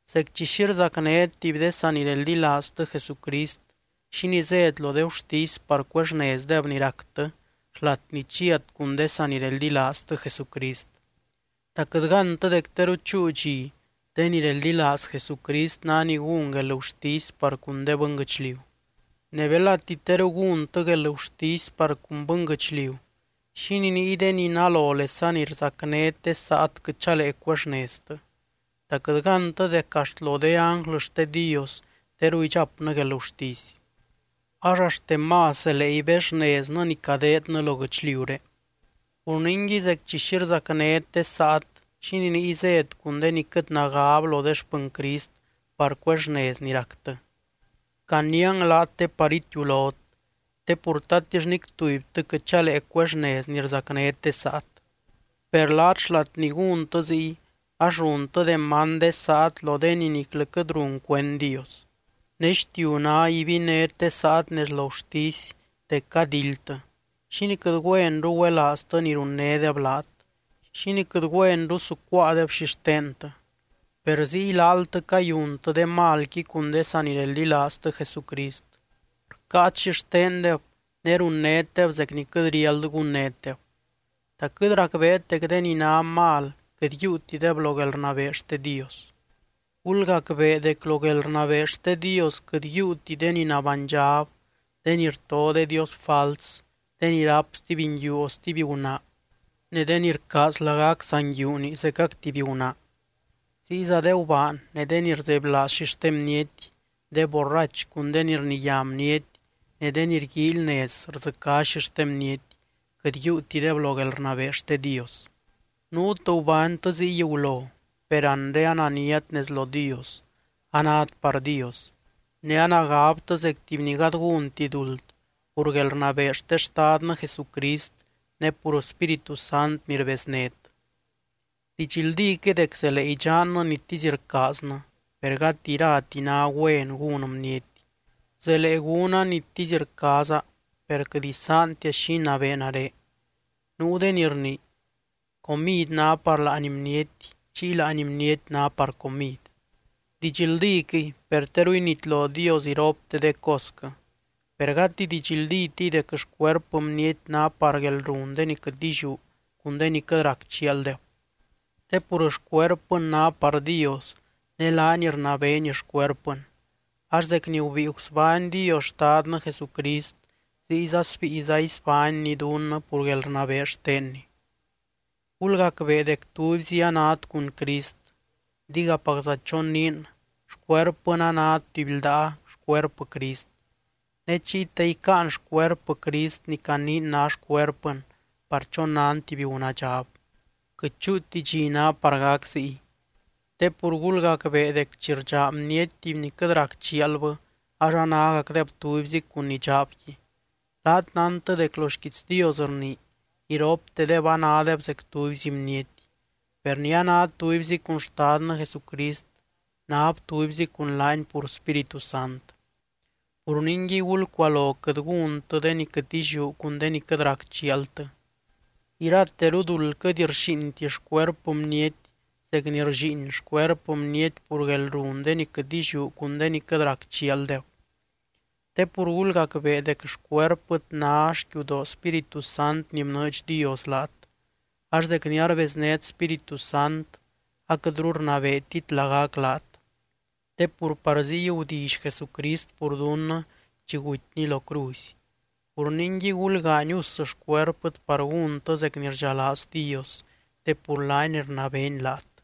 Zec chi xi rzacnét tuby de sanireldilaaztɨ Jesucrist, ¿xínii zét lo de gurtisy par cuexnezdeb ni ractɨ xlat ni chiat cun de sanireldilaaztɨ Jesucrist? ¿Ta quɨt gántɨ dec teru chúu dxi de ni reldilaaz Jesucrist ná ni gún guelgurtisy par cun de bɨnguɨchliu? Ne belati teru gúntɨ guelgurtisy par cun bɨnguɨchliu, ¿xínii niy de ni nalolesa ni rzacnét de saat quɨt chalee cuexneztɨ? ¿Ta quɨt gántɨ dec axt lo de ánglɨ xte Dios teru idxapnɨ guelgurtisy? ¡Ax axtemás zelee ibexneznɨ ni cadeednɨ lo guɨchliuré! Pur ningui zec chi xi rzacnét de saat, ¿xínii niy zét cun de ni quɨt nagab lo de xpɨny Crist par cuexnez ni ractɨ? Caniiang laat te par itiulot. Te pur, ¿tatix nic tubytɨ quɨt chalee cuexnez ni rzacnét de saat? Per laat xlat ni gúntɨ ziy ax runtɨ demand de saat lo de ni niclɨ quɨt run cuend Dios. Ne xtiu ná ibinét de saat nez lo gurtisy dec cadildtɨ, ¿xínii quɨt güenru güelaaztɨ ni runnédeb laat? ¿Xínii quɨt güenru sucuáadeb xixtentɨ? Per ziy laaltɨ cayuntɨ de malqui cun de sanireldilaaztɨ Jesucrist. Rcáat xixtendeb, ne runnétdeb zec ni quɨt riáld gunnétdeb. ¿Ta quɨt racbeet dec de ni ná mal quɨt yiiutideb lo guelrnabee xte Dios? Gulgacbee dec lo guelrnabee xte Dios quɨt yiiuti de ni nabánydxab, de ni rto de dios fals, de ni ráp stuby nguiu o stuby gunaa, ne de ni rcaaz lagac saa nguiuni zecac tuby gunaa. Ziyza de gubaan, ne de ni rzebylaaz xixte bniety, de borrach cun de ni rniyá bniety ne de ni rguíily nez rdzɨcá xixte bniety, quɨt yiiutideb lo guelrnabee xte Dios. Nuut gubánytɨ ziy gulo, per anre ananiat nez lo Dios, anát par Dios, ne anagabtɨ zec tuby ni gady gúnti duld pur guelrnabee xte Xtadnɨ Jesucrist ne pur Spíritu Sant ni rbeznét. Didxldíquɨy dec zelee idxannɨ nitisy rcaaznɨ, per gati irati ná güen gún bniety. Zelee gúna nitisy rcaaza, per quɨt isaantia xi inabee nare. Nuu de ni rnii: “Comid ná par láani bniety, chiy láani bniety ná par comid.” Didxldíquɨy, per teru initlo Dios iropte de cosquɨ. Per gati didxldítiy dec xcuerpɨ bniety ná par guelrun de ni quɨt illiú cun de ni quɨt rac chialdeb. Te pur xcuerpɨn ná par Dios, ne laany rnabeeny xcuerpɨn. Ax zec ni gubíi gusbány Dios Xtadnɨ Jesucrist, ziyza sbíiza isbánny dunnɨ pur guelrnabee xtenny. Gulgacbee dec tubyzi anát cun Crist, digapacza choniin xcuerpɨn a ná tuby ldaa xcuerpɨ Crist. Ne chiy, ¿ta icáan xcuerpɨ Crist ni caniin ná xcuerpɨn par chonan tuby gunaadxab? ¡Quɨt chúuti dxi ná par gac ziy! Te pur gulgacbee dec chi rdxaa bniety tuby ni quɨt rac chialbɨ ax anágacdeb tubyzi cun ni dxaabqui. Laat nántɨ dec lo xquiits Dios rnii: “Iroptedeb anádeb zec tubyzi bniety.” Per ni a ná tubyzi cun Xtadnɨ Jesucrist, náb tubyzi cun laany pur Spíritu Sant. Pur ningui, gulcualo quɨt gúntɨ de ni quɨt illiú cun de ni quɨt rac chialtɨ. Irateru duld quɨt rxíinti xcuerpɨ bniety zec ni rllíin xcuerpɨ bniety pur guelrun de ni quɨt illiú cun de ni quɨt rac chialdeb. Te pur gulgacbee dec xcuerpɨt ná xquiudoo Spíritu Sant ni bnɨɨdx Dios laat, ax zec ni arbeznét Spíritu Sant aquɨtru rnabeetit lagac laat. Te pur par ziy gudilly Jesucrist pur dunnɨ chi gutyny lo cruzy. Pur ningui, gulgaany us xcuerpɨt par gúntɨ zec ni rdxalaaz Dios, te pur laany rnabeeny laat.